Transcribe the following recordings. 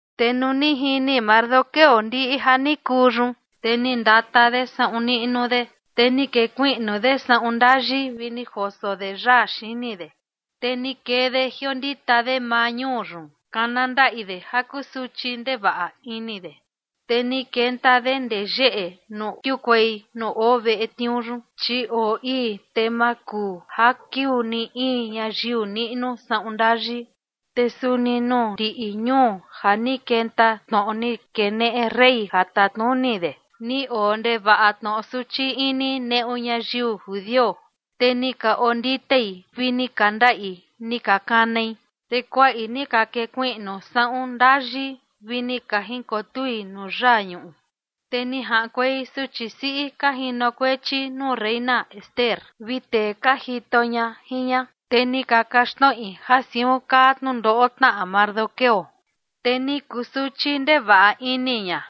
Te nuu ni jini Mardoqueo ndiꞌi ja ni kuu yun, te ni ndata de saꞌun niꞌnu de, te ni kekuiꞌnu de saꞌun ndayi vi ni joso de yaa xini de, te ni kee de jiondita de maa ñuu yun, kana ndaꞌi de ja kusuchi ndevaꞌa ini de. Te ni kenta de ndee yeꞌe nuu kiukuei nuu oo veꞌe tniuu yun, chi oo ii, te ma kuu ja kiuu ni in ñayiu niꞌnu saꞌun ndayi. Te suni nuu ndiꞌi ñuu ja ni kenta tnoꞌo ni keneꞌe rey ja tatnuni de, ni oo ndevaꞌa tnoꞌo suchi ini neꞌu ñayiu judio. Te ni ka onditei, vi ni ka ndaꞌi ni ka kanai, te kuaꞌi ni ka kekuiꞌnu saꞌun ndayi vi ni ka jinkotui nuu yaa ñuꞌu. Te ni jaꞌankuei suchi siꞌi ka jinokuechi nuu reina Ester vi tee ka jito ña jin ña, te ni ka kaxtnoꞌi ja siun kaa tnundoꞌo tnaꞌa Mardoqueo, te ni kusuchi ndevaꞌa ini ña.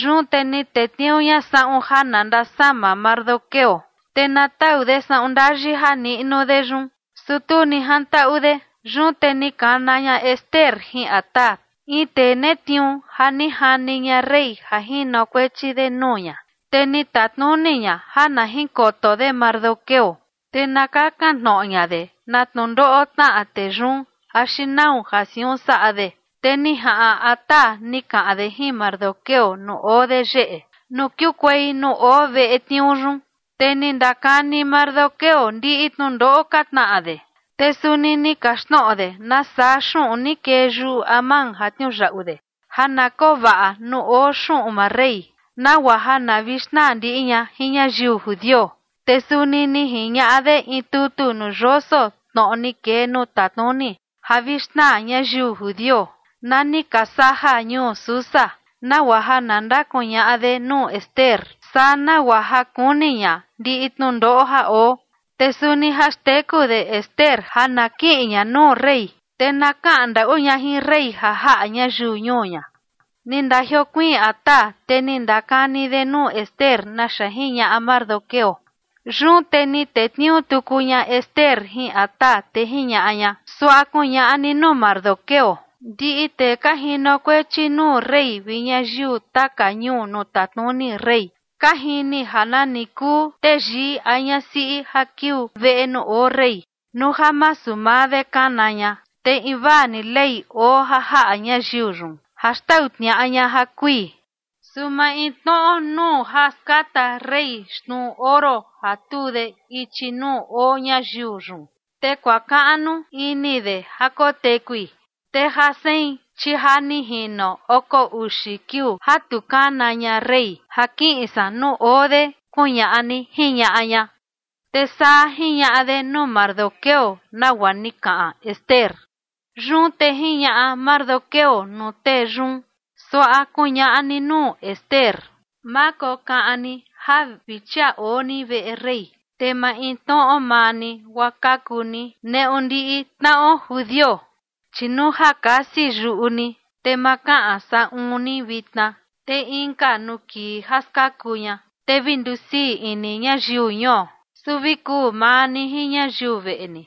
Yun te ni tetniuu ña saꞌun ja na ndasama Mardoqueo, te na tau de saꞌun ndayi ja niꞌnu de yun, su tu ni jantaꞌu de. Yun te ni kana ña Ester jin Hatac, in tee netniuu ja ni jani ña rey ja jinokuechi de nuu ña, te ni tatnuni ña ja na jinkoto de Mardoqueo, te na kakan tnoꞌo ña de na tnundoꞌo tnaꞌa tee yun axi nau ja siun saꞌa de. Te ni jaꞌan Hatac ni kaꞌan de jin Mardoqueo nuu oo de yeꞌe nuu kiukuei nuu oo veꞌe tniuu yun. Te ni ndakani Mardoqueo ndiꞌi tnundoꞌo ka tnaꞌa de, te suni ni kaxtnoꞌo de nasaa xuꞌun ni kee yuꞌu Amán ja tniuyaꞌu de ja na koo vaꞌa nuu oo xuꞌun maa rey, nagua ja na vi xnaa ndiꞌi ña jin ñayiu judio. Te suni ni jiñaꞌa de in tutu nuu yoso tnoꞌo ni kee nuu tatnuni ja vi xnaa ñayiu judio, na ni ka saja ñuu Susa, nagua ja na ndakuñaꞌa de nuu Ester, saa nagua ja kuni ña ndiꞌi tnundoꞌo ja oo. Te suni ja xteku de Ester ja na kiꞌin ña nuu rey, te na kaꞌan ndaꞌu ña jin rey ja jaꞌa ñayiu ñuu ña. Ni ndajiokuiin Hatac, te ni ndakani de nuu Ester naxa jiñaꞌa Mardoqueo. Yun te ni tetniuu tuku ña Ester jin Hatac, te jiñaꞌa ña: ―Suaꞌa kuñaꞌa ni nuu Mardoqueo: “Ndiꞌi tee ka jinokuechi nuu rey vi ñayiu taka ñuu nuu tatnuni rey, ka jini ja nani kuu teyii a ñasiꞌi ja kiuu veꞌe nuu oo rey, nuu ja masu maa de kana ña, te invaa ni ley oo ja jaꞌa ñayiu yun, ja xtau tniaꞌa ña ja kui. Su maintnoꞌo nuu ja skata rey xnuu oro ja tuu de ichi nuu oo ñayiu yun, te kuakaꞌnu ini de ja kotekui. Te ja sein, chi ja ni jino oko uxi kiuu ja tu kana ña rey ja kiꞌin san nuu oo de”, kuñaꞌa ni ―jiñaꞌa ña. Te saa jiñaꞌa de nuu Mardoqueo nagua ni kaꞌan Ester. Yun te jiñaꞌa Mardoqueo nuu tee yun: ―Suaꞌa kuñaꞌa ni nuu Ester: “Ma kokaꞌan ni ja vi chia oo ni veꞌe rey, te maintnoꞌo maa ni guaa kaku ni neꞌu ndiꞌi tnaꞌo judio. Chi nuu ja kasi yuꞌu ni, te ma kaꞌan saꞌun ni vitna, te inka nuu kii ja skaku ña, te vi ndusii ini ñayiu ñuo, su vi kuu maa ni jin ñayiu veꞌe ni,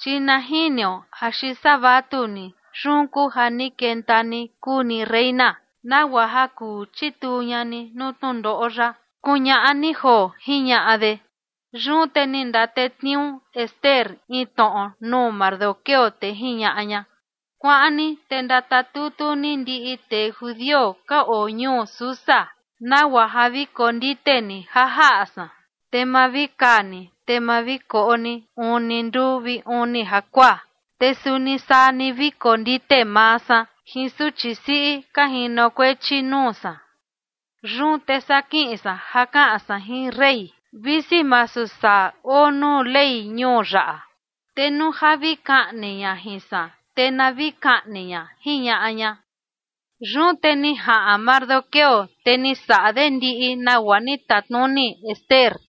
chi na jiniu axi saa vatuni yun kuu ja ni kenta ni kuu ni reina, nagua ja kuu chituu ña ni nuu tnundoꞌo yaꞌa”, kuñaꞌa ni joo ―jiñaꞌa de. Yun te ni ndatetniuu Ester in tnoꞌo nuu Mardoqueo, te jiñaꞌa ña: “Kuaꞌan ni te ndatatutu ni ndiꞌi tee judio ka oo ñuu Susa, nagua ja vi kondite ni ja jaꞌa san. Te ma vi kaa ni te ni ma vi koꞌo ni uni nduu vi uni jakuaa. Te suni saa ni vi kondite maa san jin suchi siꞌi ka jinokuechi nuu san. Yun te saa kiꞌin san ja kaꞌan san jin rey, visi masu saa oo nuu ley ñuu yaꞌa. Te nuu ja vi kaꞌni jin san, te na vi kaꞌni ña”, jiñaꞌa ña. Yun te ni jaꞌan Mardoqueo, te ni saꞌa de ndiꞌi nagua ni tatnuni Ester.